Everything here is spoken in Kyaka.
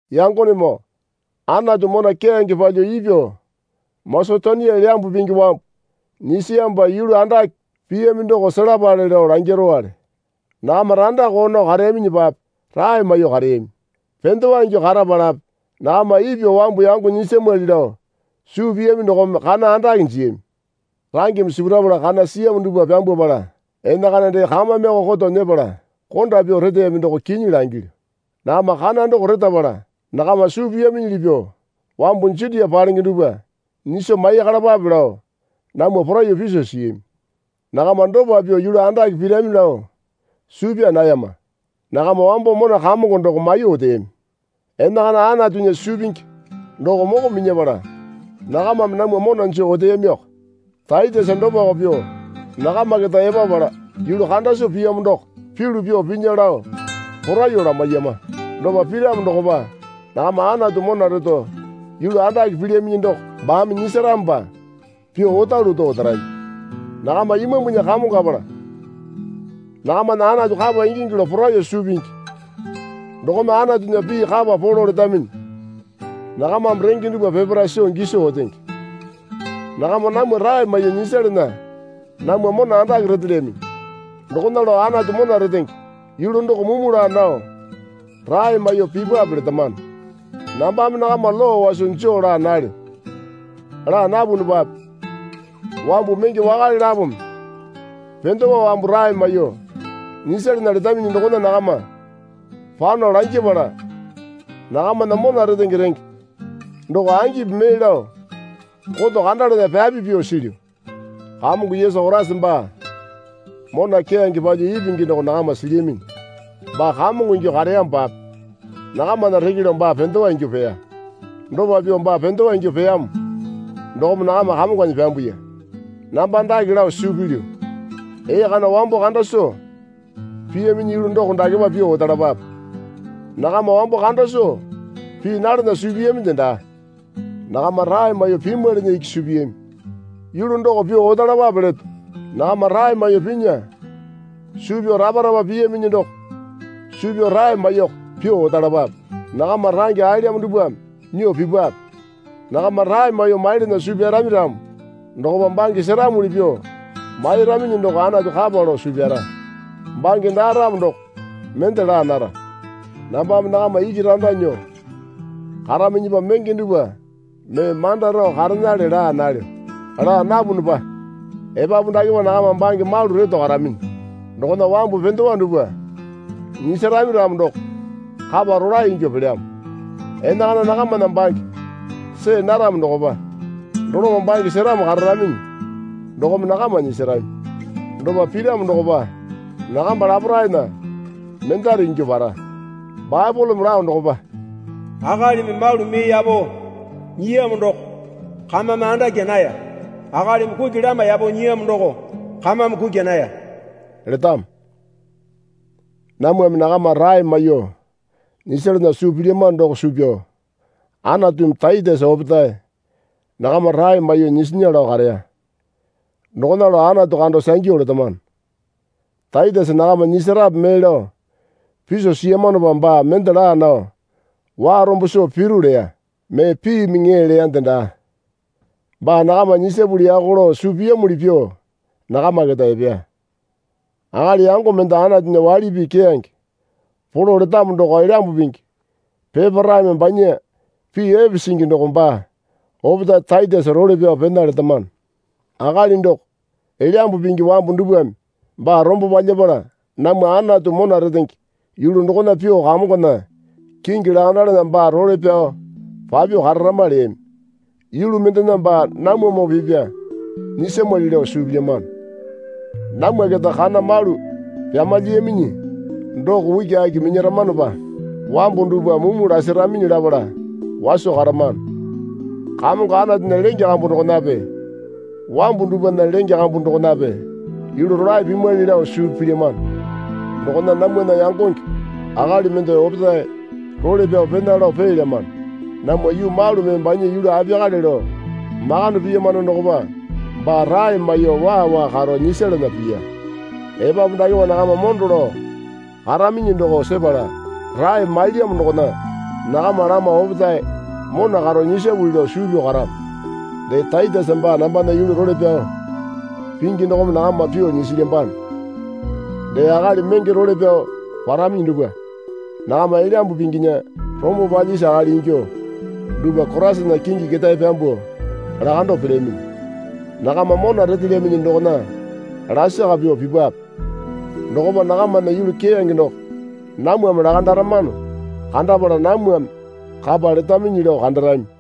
Yangonemoo Anatu mona keyange palyuo ipyuo Masetonia Elyambu Pingi wambu nyisiyamopa yulu andake piyami doko selapale lao langirowale. Nakama randa koo nao kareyaminyipape rae maiyuo kareyami. Pendewa ingyuo karapalape nakama ipyuo wambu yango nyisamwali lao suu piyami dokome kana andake jiyami. Rangeme sipurapala kana siyamo dupwa pyambwapala enakana dee kamameko koto nyepala konda pyuo reteyami doko kinyi langilyu. Nakama kana doko retapala nakama suu piyaminyili pyuo wambu Jutia palenge dupwa nyiso maiyakalapape lao namwa poraiyuo piso siyami. Nakama dopa pyuo yulu andake pirami lao suu pyaa nayama. Nakama wambo mona Kamongo doko maiyuo oteyami. Enakana Anatunya suu pingi doko moko minyapala nakamame namwa mona joo oteyamiko. Taitesa dopako pyuo nakama keta epapala yulu kanda soo piyamo doko pyulu pyuo pinya lao poraiyuo lamaiyama. Dopa piramo dokopa nakama Anatu mona reto yulu andake pilyaminyi doko baame nyisaramopa pyuo otalu oto otarami. Nakama Imambunya kamongapala nakamana Anatu kapa ingingi lao poraiyuo suu pingi. Dokome Anatunya pii kapa polo letaminyi. Nakamame renge dupwa peparae soo giso otenge. Nakama namwa rae maiyuo nyisalana namwa mona andake retelyaminyi. Dokona lao Anatu mona retenge yulu doko mumu laa nao rae maiyuo pipape letamano. Nambame nakama lowa waso joo laa nalyo. Laa napunupape wambu menge wakale lapome pendewa wambu rae maiyuo nyisalana letaminyi dokona nakama pano langyapala nakamana mona retenge renge doko angipi mee lao koto kandalana pyapi pyuo silyu. Kamongo Yesu Koraisa baa mona keyange palyuo ipingi doko nakama silyaminyi. Baa kamongo ingyuo kareyamopape nakamana reke lao baa pendewa ingyuo peya. Dopa pyuo baa pendewa ingyuo peyamo dokome nakama kamonganyi pyambuya. Namba dake lao suu pilyu. Ee kana wambo kanda soo piyaminyi yulu doko dakepa pyuo otalapape. Nakama wambo kanda soo pii nalana suu piyaminde daa. Nakama rae maiyuo pimwailinyi iki suu piyami. Yulu doko pyuo otalapape leto. Nakama rae maiyuo pinya suu pyao rapa rapa piyaminyi doko suu pyao rae maiyuoko pyuo otalapape. Nakama range aelyamo dupwame nyuo pipape. Nakama rae maiyuo mailana suu pyarami ramo dokopa bange seramuli pyuo mairaminyi doko Anatu kapa lao suu pyara. Bange daa ramo doko mende laa nara. Nambame nakama iki randa nyuo karaminyipa menge dupwa mee manda rao karenale laa nalyo. Laa napunupa epapu dakepa nakama bange malu reto karaminyi dokona wambu pendewa dupwa nyisarami ramo doko kapa rolae ingyuo pelyamo. Enakana nakamana bange see naramo dokopa doloma bange seramo kararaminyi dokome nakama nyisarami. Dopa piramo dokopa nakamba laparaena mendare ingyuo para. Baepoleme lao dokopa, Akalimi malu mee yapo nyiyamo doko kamame andakya naya. Akalimi kuki lama yapo nyiyamo doko kamame kukya naya letamo. Namwame nakama rae maiyuo nyisalana suu pilyamano doko suu pyao Anatumi Taitesa opetae nakama rae maiyuo nyisinya lao kareya. Dokona lao Anatu kando sangyu letamano. Taitesa nakama nyisarepe mee lao piso siyamanopa baa mende laa nao warombo soo piru leya. Mee piimi ŋee leyande daa. Baa nakama nyisapuli yaka lao suu piyamuli pyuo nakama keta epeya. Akali yango mende Anatunya waili pii keyange polo letamo doko Elyambu Pingi peparaeme banya pii epe singi doko baa opetae Taitesa role pyao pena letamano. Akali doko, Elyambu Pingi wambu dupwame baa rombo palyapala namwa Anatu mona retenge yulu dokona pyuo kamongona kingi lakandalana baa role pyao papyuo kararama leyami. Yulu mendena baa namwamoo pipya nyisamwali lao suu pilyamano. Namwa keta kana malu pyamalyiyaminyi doko ukiaki minyaramanopa wambu dupwa mumu lasaraminyi lapala waso karamano. Kamongo Anatunya lenge kambu dokonape wambu dupwana lenge kambu dokonape yulu rolae pimwali lao suu pilyamano. Dokona namwana yangonge akali mende opetae role pyao pena lao peelyamano. Namwa yuu malu mee banya yulu apiyakale lao makande piyamano dokopa baa rae maiyuo waa waa karo nyisalana piya. Epapu dakepa nakama mondo lao karaminyi doko sepala rae mailyamo dokona nakama lama opetae mona karo nyisapuli lao suu pyao karamo. Dee Taitesa baa nambana yulu role pyao pingi dokome nakama pyuo nyisilyambano. Dee akali menge role pyao paraminyi dupwa nakama Elyambu Pinginya rombo palyisi akali ingyuo dupwa Koraisana kingi ketae pyambuo lakando pelyaminyi. Nakama mona retelyaminyi dokona lasaka pyuo pipape. Dokopa nakamana yulu keyange doko namwame lakandaramano kandapala namwame kapa letaminyi lao kandarami.